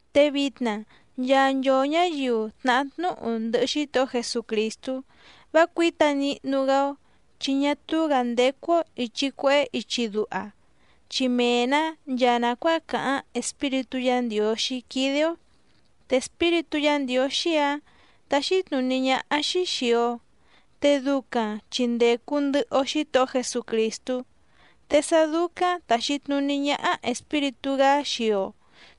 Te vitna nchaa nchoo ñǎyiu tnàhá tnúhu ndɨhɨ Xítohó Jesucrìstú vá cuǐta nihnu‑gá‑ó, chi ñá túú‑gǎ ndécú‑ó ìchi cuehé ichi duha, chi mee‑nǎ nchaa nàcuáa càháⁿ Espíritú Yǎ Ndiǒxí quídé‑ó. Te Espíritú Yǎ Ndiǒxí‑ǎⁿ táxí tnùní ñáhá‑xí xìi‑o, te ducaⁿ chi ndècu ndɨhɨ‑o Xítohó Jesucrìstú, te sá dúcáⁿ tàxi tnuní ñáhá Espíritú‑gá xii‑o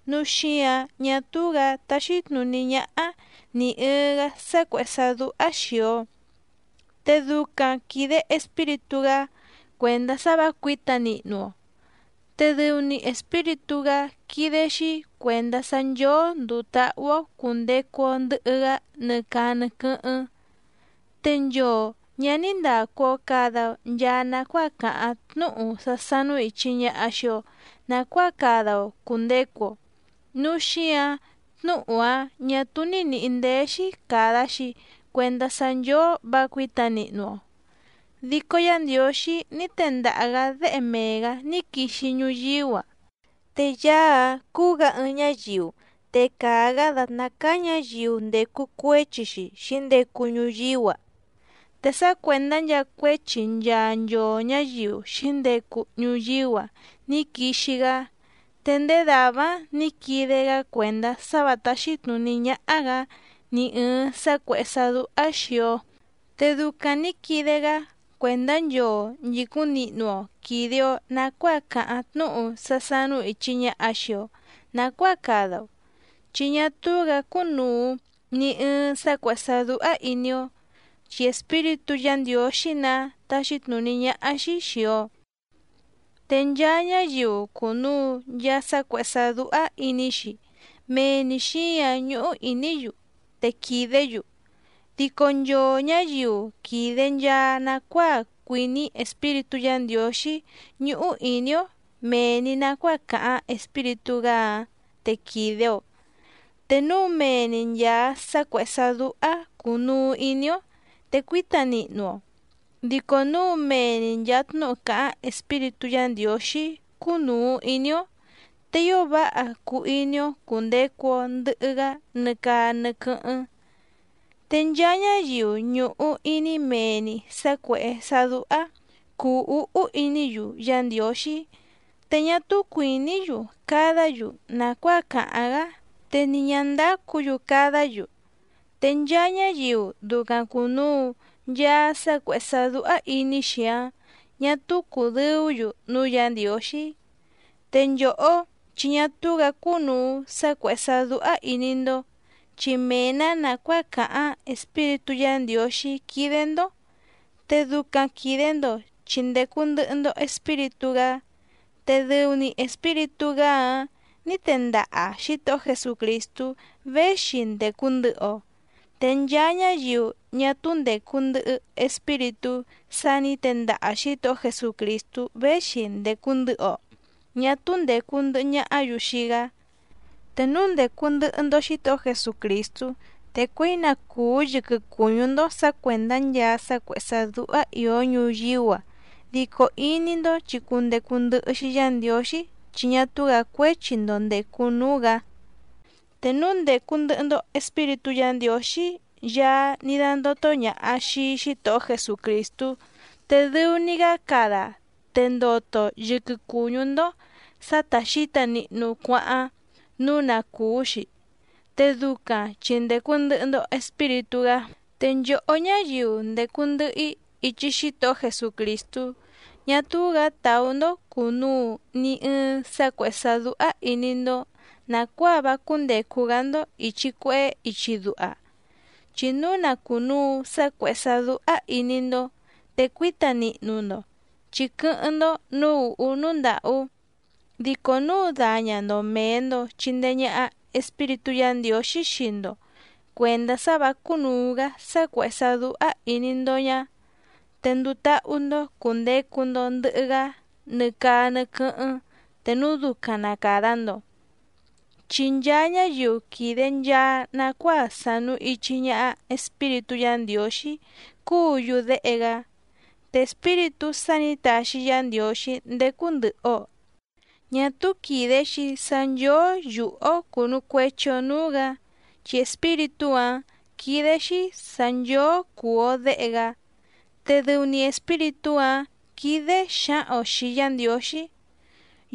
nǔu xíǎⁿ ñá túú‑gǎ táxí tnùní ñáhá nì ɨɨⁿ‑gá sá cuèhé sá dúhá xìi‑o, te ducaⁿ quìde Espíritú‑gá cuèndá sá vǎ cuǐta nihnu‑o, te dɨu‑ni Espíritú‑gá quídé‑xí cuèndá sá nchóó ndùu táhú‑ó cùndecu‑o ndɨhɨ‑gá nɨ caa nɨ quɨ́hɨ́ⁿ. Te nchoo ñǎ ní ndàcu‑o cada‑o nchaa nacuáa càháⁿ tnúhu sá sánú ìchi ñaha xii‑o nacuáa cada‑o cùndecu‑o, núu xíǎⁿ tnúhu‑áⁿ ñà túú ní nìhí ndéé‑xí càda‑xi cuendá sá nchóó vǎ cuǐta nihnu‑o. Dico Yá Ndiǒxí ní tendaha‑gǎ Déhe mee‑gǎ ní quixi ñuyíú‑a, te Yaá‑áⁿ cúú‑gǎ ɨɨⁿ ñáyiu, te càa‑gá dàtná cáá ñǎyiu ndècu cuéchi‑xi xǐndecu ñuyíú‑a, te sá cuèndá nchaa cuéchi nchaa nchoo ñǎyiu xǐndecu ñuyíú‑a ní quixi‑gá, te ndéé dàvá‑áⁿ nǐ quide‑gá cuèndá sá vǎ táxí tnùní ñáhá‑gǎ ni ɨ̀ɨⁿ sá cuèhé sá dúhá xìi‑o. Te ducaⁿ nǐ quide‑gá cuèndá nchoo nchìcúⁿ nihnu‑o quìde‑o nacuáa càháⁿ tnúhu sá sánú ìchi ñaha xii‑o nacuáa cada‑o, chi ñá túú‑gǎ cúnùu ni ɨɨⁿ sá cuèhé sá dúhá ìní‑ó, chi Espíritú Yǎ Ndiǒxí‑nǎ táxí tnùní ñáhá‑xí xìi‑o. Te nchaa ñáyiu cùnuu nchaa sá cuèhé sá dúhá ìní‑xi mee‑ni xǐǎⁿ ñúhú ìní‑yu te quìdé‑yu. Dico nchoo ñǎyiu quìde nchaa nacuáa cuìní Espíritú Yǎ Ndiǒxí ñúhú ìní‑ó mèe‑ni nacuáa càháⁿ Espíritú‑gá‑áⁿ te quìde‑o. Te núu mee‑ni nchàa sá cuèhé sá dúhá cùnuu iní‑ó, te cuíta nihnu‑o, dico núu mee‑ni nchàa tnúhu càháⁿ Espíritú Yǎ Ndiǒxí cúnùu iní‑ó, te ío váha cuu iní‑ó cùndecu‑o ndɨhɨ‑gá nɨ caa nɨ quɨ́hɨ́ⁿ. Te nchaa ñáyiu ñùhu iní mee‑ni sǎ cuèhé sá dúhá cùu úhú iní‑yu Yá Ndiǒxí, te ñá túú cuìní‑yu cadá‑yu nàcuáa càháⁿ‑gá, te ni ñǎ ndácǔ‑yu cadá‑yu. Te nchaa ñáyiu ducaⁿ cùnuu nchaa sá cuèhé sá dúhá ìní‑xi‑áⁿ ñà túú cùdɨú‑yu núú Yǎ Ndiǒxí. Te nchòhó chi ñá túú‑gǎ cúnùu sá cuèhé sá dúhá ìní‑ndó, chi mee‑nǎ nàcuáa càháⁿ Espíritú Yǎ Ndiǒxí quídé‑ndó, te ducaⁿ quìde‑ndo chi ndècu ndɨhɨ‑ndo Espíritú‑gá, te dɨu‑ni Espíritú‑gá‑áⁿ nǐ tendaha Xǐtohó Jesucrìstú véxi ndècu ndɨhɨ‑o, te nchaa ñáyiu ñá túú ndècu ndɨhɨ Espíritú sá nǐ tendaha Xǐtohó Jesucrìstú véxi ndècu ndɨhɨ‑o ñá túú ndècu ndɨhɨ ñahá‑yu xii‑gá. Te núu ndècu ndɨhɨ‑ndo Xítohó Jesucrìstú, te cuěi na cùú yɨquɨ cùñú‑ndó sǎ cuèndá nchaa sá cuèhé sá dúhá ìó ñuyíú‑a, dico iní‑ndó chi cundecu ndɨhɨ‑xi Yá Ndiǒxí chi ñá túú‑gǎ cuéchi‑ndo ndècu núú‑gǎ. Te núu ndècu ndɨhɨ‑ndo Espíritú Yǎ Ndiǒxí Yaá ní dándótó ñàha xii Xítohó Jesucrìstú, te dɨu‑ni‑gá cada te ndoto yɨquɨ cùñú‑ndó sǎ tá xǐta nihnu cuáháⁿ nǔu na cùú‑xi, te ducaⁿ chi ndècu ndɨhɨ‑ndo Espíritú‑gá. Te nchòhó ñáyiu ndècu ndɨhɨ‑í ichi Xítohó Jesucrìstú, ñá túú‑gǎ tàú‑ndó cùnuu ni ɨɨⁿ sá cuèhé sá dúhá ìní‑ndó nàcuáa vá cúndècu‑gá‑ndó ìchi cuehé ichi duha. Chi núu na cùnuu sá cuèhé sá dúhá ìní‑ndó te cuíta nihnu‑ndo, chi quɨ́hɨ́ⁿ‑ndó nǔú ùhú núú ndàhú. Dico núu daña‑ndo mèe‑ndo chindee ñaha Espíritú Yǎ Ndiǒxí xii‑ndo cuèndá sá vǎ cúnùu‑gá sá cuèhé sá dúhá ìní‑ndó ñá, te nduu táhú‑ndó cùndecu‑ndo ndɨhɨ‑gá nɨ caa nɨ quɨ́hɨ́ⁿ te núu ducaⁿ na càda‑ndo. Chi nchaa ñáyiu quìde nchaa nacuáa sànu ichi ñaha Espíritú Yǎ Ndiǒxí cúǔ‑yu déhe‑gá. Te Espíritú sá nǐ taxi Yá Ndiǒxí ndécú ndɨ̀hɨ‑o ñá túú quìde‑xi sá nchóó yùhú‑ó cùnu cuechi‑o núú‑gǎ, chi Espíritú‑áⁿ quídé‑xí sǎ nchóó cùu‑o déhe‑gá, te dɨu‑ni Espíritú‑áⁿ quídé xǎhaⁿ‑o xìi Yá Ndiǒxí: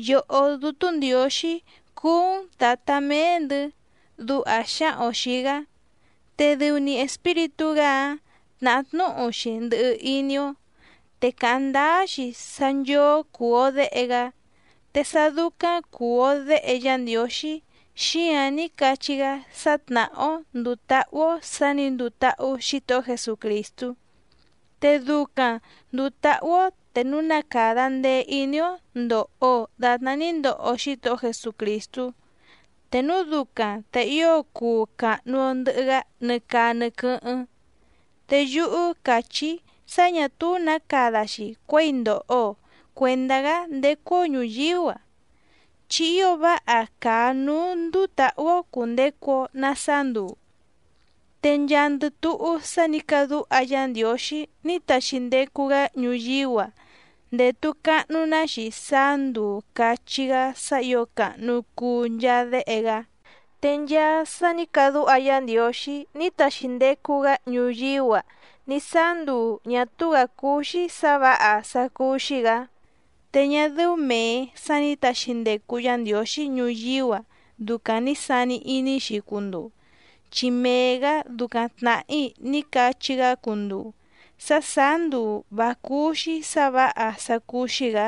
“¡Yòhó Dútú Ndiǒxí cúú‑n Tǎtá méé‑ndɨ̌!”, duha xǎhaⁿ‑o xìi‑gá. Te dɨu‑ni Espíritú‑gá‑ǎⁿ tnàhá tnúhu‑xi ndɨhɨ iní‑ó, te càháⁿ ndáá‑xi sá nchóó cùu‑o déhe‑gá. Te sá dúcáⁿ cùu‑o déhe Yá Ndiǒxí xíǎⁿ ní cachí‑gá sá tnàhá‑ó ndùu táhú‑ó sǎ nǐ nduu táhú Xǐtohó Jesucrìstú, te ducaⁿ ndùu táhú‑ó te núu na càda ndee iní‑ó ndòho‑o datná ní ndoho Xítohó Jesucrìstú, te núu ducaⁿ te ío cuu càhnu‑o ndɨhɨ‑gá nɨ caa nɨ quɨ́hɨ́ⁿ. Te yúhú càchí‑í sá ñà túú nǎ cada‑xi cuěi ndòho‑o cuendá‑gá ndécú‑ó ñùyíú‑a, chi ío váha càa núú ndúú tǎhú‑ó cùndecu‑o na saá nduu. Te nchaandɨ túhú sá nǐ cadúha Yá Ndiǒxí ní taxi ndecu‑gá ñuyíú‑a ndètu cahnu‑ná‑xi sáá nduu càchí‑gá sá ǐo càhnu cuu nchaa déhe‑gá. Te nchaa sá nǐ cadúha Yá Ndiǒxí ní taxi ndecu‑gá ñuyíú‑a ní sáá nduu ñà túú‑gǎ cúú‑xí sǎ vǎha sá cúú‑xí‑gǎ. Te ñá dɨ́ú mèe sá nǐ taxi ndecu Yá Ndiǒxí ñuyíú‑a ducaⁿ ni sàni iní‑xi cunduu, chi mee‑gǎ ducaⁿ tnàhí ní cachí‑gá cunduu sá sàá nduu vǎ cúú‑xí sǎ vǎha sá cúú‑xí‑gǎ,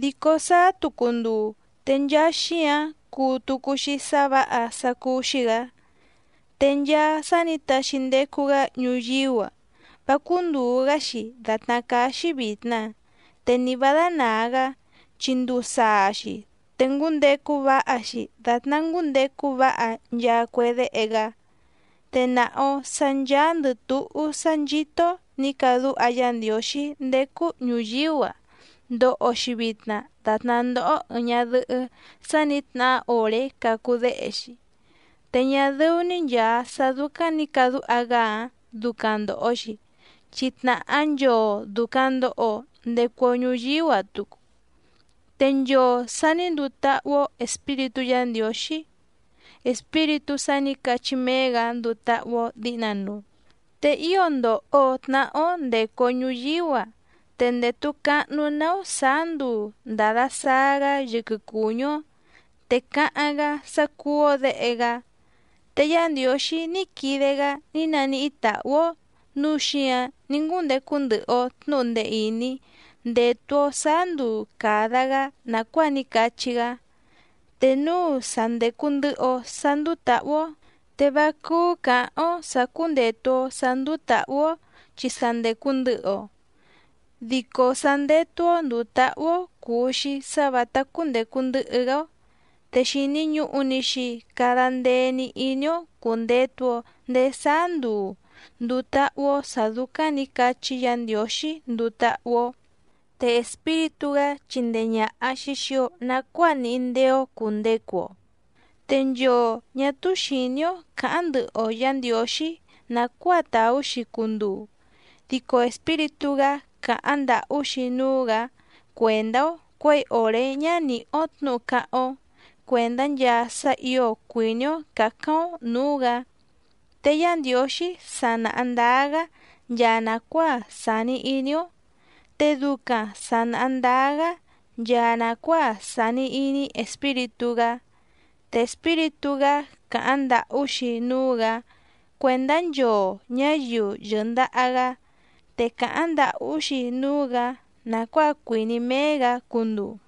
dico sáá tucu nduu te nchaa xíǎⁿ cuu tucu‑xi sá vǎha sá cúú‑xí‑gǎ. Te nchaa sá nǐ taxi ndecu‑gá ñuyíú‑a vá cúndùu‑gá‑xi dàtná cáá‑xí vìtna te ni vǎ dánàa‑gá, chi nduu saa‑xi te ngúndecu váha‑xi dàtná ngúndecu váha nchaa cue déhe‑gá. Te nàha‑o sá ncháándɨ̀ túhú sá nchító nǐ cadúha Yá Ndiǒxí ndécú ñùyíú‑a ndòho‑xi vitna datná ndóhó ɨ̀ɨⁿ ñadɨhɨ́ sa ní tnahá òré cacu déhe‑xi. Te ñá dɨ́ú‑ní nchàa sá dúcáⁿ nǐ cadúha‑gá‑ǎⁿ ducaⁿ ndòho‑xi, chi tnàhá nchoo dùcaⁿ ndoho‑o ndecu‑o ñuyíú‑a tucu, te nchoo sà ní nduu táhú‑ó Espíritú Yǎ Ndiǒxí Espíritú sá nǐ cachí méé‑gǎ nduu táhú‑ó dǐhnanuu. Te ío ndòho tnahá‑ó ndècu‑o ñuyíú‑a te ndètu cahnu‑ná‑ó sǎá nduu ndàda saa‑gá yɨquɨ cùñú‑ó, te cáháⁿ‑gá sá cúú‑ó děhe‑gá. Te Yá Ndiǒxí ní quide‑gá ní naníhí tàhú‑ó nǔu xíǎⁿ ní ngúndecu ndɨhɨ‑o tnǔhu ndee ìní ndétú‑ó sǎá nduu càda‑gá nàcuáa ní cachí‑gá, te núu sa ndècu ndɨhɨ‑o sá ndúú tǎhú‑ó te vá cúú cǎháⁿ‑ó sǎ cúndètu‑o sá ndúú tǎhú‑ó chi sa ndècu ndɨhɨ‑o. Dico sá ndétú‑ó ndùu táhú‑ó cùu‑xi sá vǎtá cúndècu ndɨhɨ‑gá‑ó, te xìni ñuhu‑ni‑xi cada ndee‑ni iní‑ó cùndetu‑o ndéé sáá nduu ndùu táhú‑ó sǎ dúcáⁿ nǐ cachí Yǎ Ndiǒxí nduu táhú‑ó. Te Espíritú‑gá chindee ñàha‑xi xii‑o nacuáa níhí ndéé‑ó cùndecu‑o, te nchoo ñà túú xìní‑ó cǎháⁿ ndɨhɨ‑o Yǎ Ndiǒxí nàcuáa tàú‑xi cunduu dico Espíritú‑gá càháⁿ ndàhú‑xi núú‑gǎ cuèndá‑ó cuěi òré ñá nìhí‑ó tnǔhu cáháⁿ‑ó cuèndá nchaa sá ǐo cuìní‑ó cǎcáⁿ‑ó nǔú‑gǎ. Te Yá Ndiǒxí sa nàha ndáá‑gá nchaa nàcuáa sàni iní‑ó, te ducaⁿ sà naha ndáá‑gá nchaa nàcuáa sàni iní Espíritú‑gá. Te Espíritú‑gá càháⁿ ndàhú‑xi núú‑gǎ cuèndá nchoo ñǎyiu yɨ̀ndaha‑gá, te càháⁿ ndàhú‑xi núú‑gǎ nàcuáa cuìní méé‑gǎ cunduu.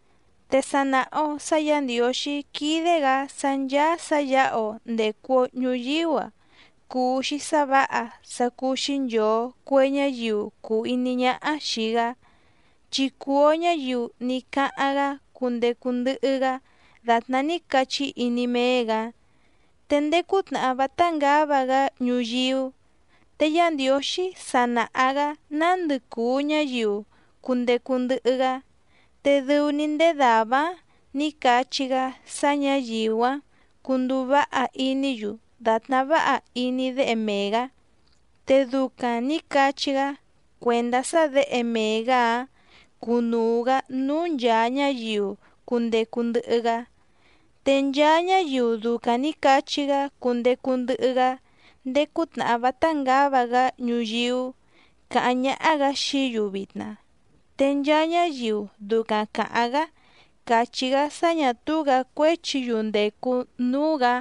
Te sa nàha‑o sá Yǎ Ndiǒxí quídé‑gǎ sá ncháá sǎ yǎha‑o ndècu‑o ñuyíú‑a cùu‑xi sá vǎha sá cúú‑xí nchòo cue ñáyiu cùu iní ñáhá xìi‑gá, chi cùu‑o ñáyiu ní cáháⁿ‑gá cundecu ndɨhɨ‑gá dàtná ní cachí iní méé‑gǎ. Te ndéé cútnàhá vátá ngǎva‑gá ñuyíú, te Yá Ndiǒxí sa nàha‑gá nándɨ cùu ñáyiu cundecu ndɨhɨ‑gá, te dɨu‑ni ndéé dàvá‑áⁿ nǐ cachí‑gá sá ñǎyiu‑áⁿ cunduu váha iní‑yu dàtná váha iní Déhe mee‑gǎ, te ducaⁿ nǐ cachí‑gá cuèndá sá Děhe mee‑gǎ‑áⁿ cunuu‑gǎ núú nchàa ñáyiu cundecu ndɨhɨ‑gá. Te nchaa ñáyiu ducaⁿ nǐ cachí‑gá cundecu ndɨhɨ‑gá ndéé cútnàhá vátá ngǎva‑gá ñuyíú càháⁿ ñáhá‑gǎ xií‑yu vitna, te nchaa ñáyiu ducaⁿ càháⁿ‑gá càchí‑gá sá ñà túú‑gǎ cuéchi‑yu ndècu núú‑gǎ,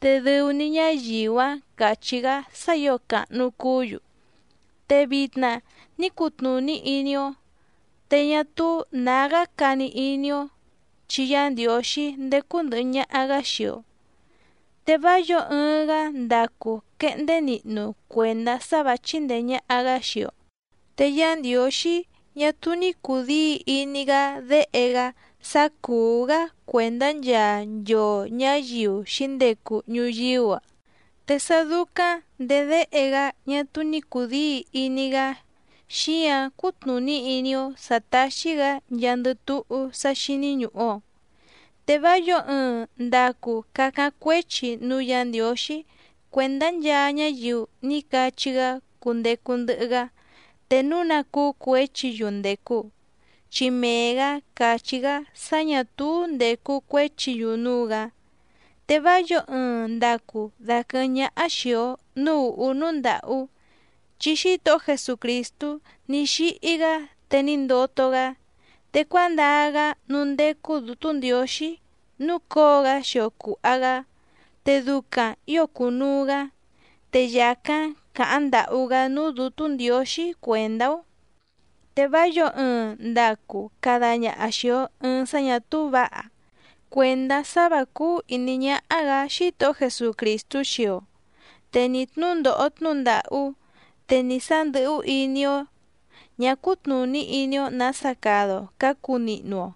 te dɨu‑ni ñáyiu‑áⁿ cachí‑gá sá ǐo càhnu cuú‑yu. Te vitna ní cutnùní iní‑ó, te ñá túú nǎgá cani iní‑ó, chi Yá Ndiǒxí ndécú ndɨ̀hɨ ñaha‑gá xii‑o, te vá yǒo ɨɨⁿ‑gá ndacu quehndé nihnu cuèndá sá vǎ chíndèe ñaha‑gá xii‑o. Te Yá Ndiǒxí ñá túú ní cùdíi iní‑gá Déhe‑gá sá cùú‑gá cuèndá nchaa nchoo ñǎyiu xǐndecu ñuyíú‑a, te sá dúcáⁿ ndèé Déhe‑gá ñá túú ní cùdíi iní‑gá xíǎⁿ cútnùní iní‑ó sǎ táxí‑gǎ nchaandɨ túhú sá xíní ñùhu‑o. Te vá yǒo ɨɨⁿ ndacu cacáⁿ cuéchi núú Yǎ Ndiǒxí cuèndá nchaa ñáyiu ní cachí‑gá cundecu ndɨhɨ‑gá te núu ná cúú cuěchi‑yu ndècu. Chi mee‑gǎ càchí‑gá sá ñà túú ndècu cuéchi‑yu núú‑gǎ. Te vá yǒo ɨɨⁿ ndacu daquɨ̀hɨ́ⁿ ñáhá xìi‑o núú ùhú núú ndàhú, chi Xítohó Jesucrìstú ní xíhí‑gá te ní ndoto‑gá, te cuándaa‑gá núú ndécú Dǔtú Ndiǒxí núcǒo‑gá xio cùha‑gá, te ducaⁿ ǐo cùnuu‑gá, te yàcáⁿ càháⁿ ndàhú‑gá núú Dǔtú Ndiǒxí cuèndá‑ó. Te vá yǒo ɨɨⁿ ndacu cada ñaha xìi‑o ɨɨⁿ sá ñà túú vǎha cuèndá sá vǎ cúú ìní ñáhá‑gǎ Xítohó Jesucrìstú xii‑o, te ni tnúndòho tnúhu ndàhú, te ni sá ndɨ̀hú iní‑ó ñǎ cútnùní iní‑ó nǎsa cada‑o cǎcu nihnu‑o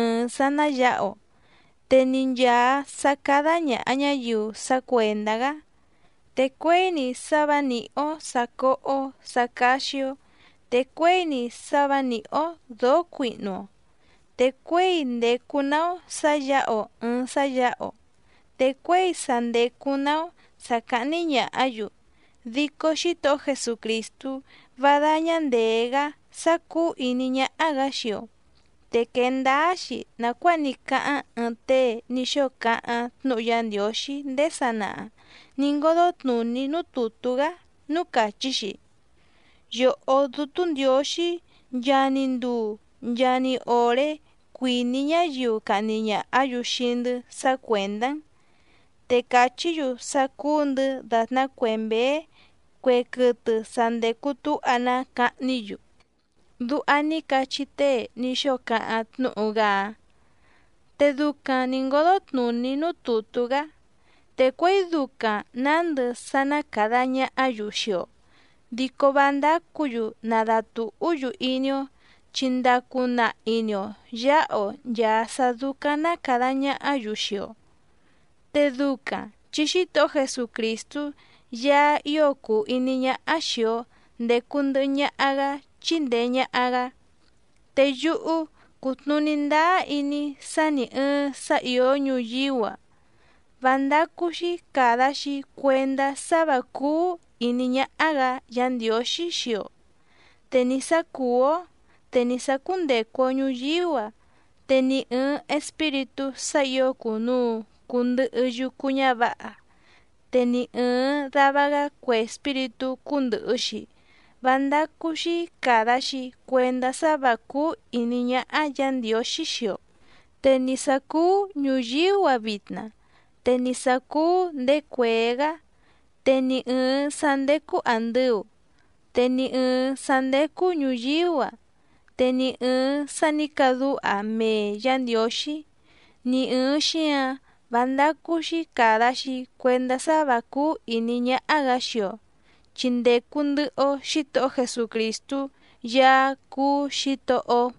ɨ̀ɨⁿ sá ná yǎha‑o, te ni nchàa sá cádá ñàha ñáyiu sá cuèndá‑gá, te cuěi‑ni sá vǎ nìhí‑ó sǎ cóhó sǎ cáxí‑ó, te cuěi‑ni sá vǎ nìhí‑ó dǒó cuihnu‑o, te cuěi ndècu‑ná‑ó sǎ yǎha‑o ɨ̀ɨⁿ sá yǎha‑o, te cuěi sa ndècu‑ná‑ó sǎ cáhní ñàhá‑yu, dico Xítohó Jesucrìstú vá dáñá ndèé‑gá sá cúú ìní ñáhá‑gǎ xii‑o. Te quee ndáá‑xi nàcuáa ní cáháⁿ ɨɨⁿ tée ní xóo cáháⁿ tnúhu Yá Ndiǒxí ndéé sanaha nǐ ngódó tnùní núú tùtú‑gá núú càchí‑xi: Yòhó Dútú Ndiǒxí nchaa‑ni nduu nchaa‑ni òré cuìní ñáyiu cahni ñàhá‑yu xii‑ndɨ́ sá cuèndá‑n, te càchí‑yu sá cúú‑ndɨ̌ dàtná cue mběé cue quɨtɨ sa ndècu túha‑ná cahní‑yu. Duha ní cachí tée ní xóo cáháⁿ tnúhu‑gá‑áⁿ, te ducaⁿ nǐ ngódó tnùní núú tùtú‑gá. Te cuěi ducaⁿ nǎndɨ sá ná càda ñahá‑yu xii‑o, dico vá ndácǔ‑yu nadatùhú‑yu iní‑ó chi ndacu nahi‑ni‑o yǎha‑o nchàa sá dúcáⁿ ná càda ñahá‑yu xii‑o, te ducaⁿ chi Xítohó Jesucrìstú Yaá ío cùu iní ñáhá xìi‑o ndecu ndɨhɨ ñaha‑gá chíndèe ñaha‑gá. Te yúhú cútnùní ndáá iní‑í sá nì ɨɨⁿ sá ìó ñuyíú‑a vá ndácú‑xí càda‑xi cuendá sá vǎ cúú ìní ñáhá‑gǎ Yǎ Ndiǒxí xii‑o, te ni sǎ cùú‑ó, te ni sǎ cúndècu‑o ñuyíú‑a, te ni ɨ̀ɨⁿ espíritú sá ǐo cùnuu cundɨhɨ yucu ñávǎha te ni ɨ̀ɨⁿ dava‑gá cue espíritú cúndɨ̀hɨ‑xi vá ndácú‑xí càda‑xi cuendá sá vǎ cúú ìní ñáhá Yǎ Ndiǒxí xii‑o. Te ni sǎ cúú ñùyíú‑a vitna, te ni sǎ cúú ndèé cuèé‑gá, te ni ɨ̀ɨⁿ sá ndécú àndɨu, te ni ɨ̀ɨⁿ sá ndécú ñùyíú‑a, te ni ɨ̀ɨⁿ sá nǐ cadúha mee Yǎ Ndiǒxí, ni ɨ̀ɨⁿ xíǎⁿ vá ndácú‑xí càda‑xi cuendá sá vǎ cúú ìní ñáhá‑gǎ xii‑o chi ndècu ndɨhɨ‑o Xítohó Jesucrìstú Yaá cúú Xǐtohó‑ó.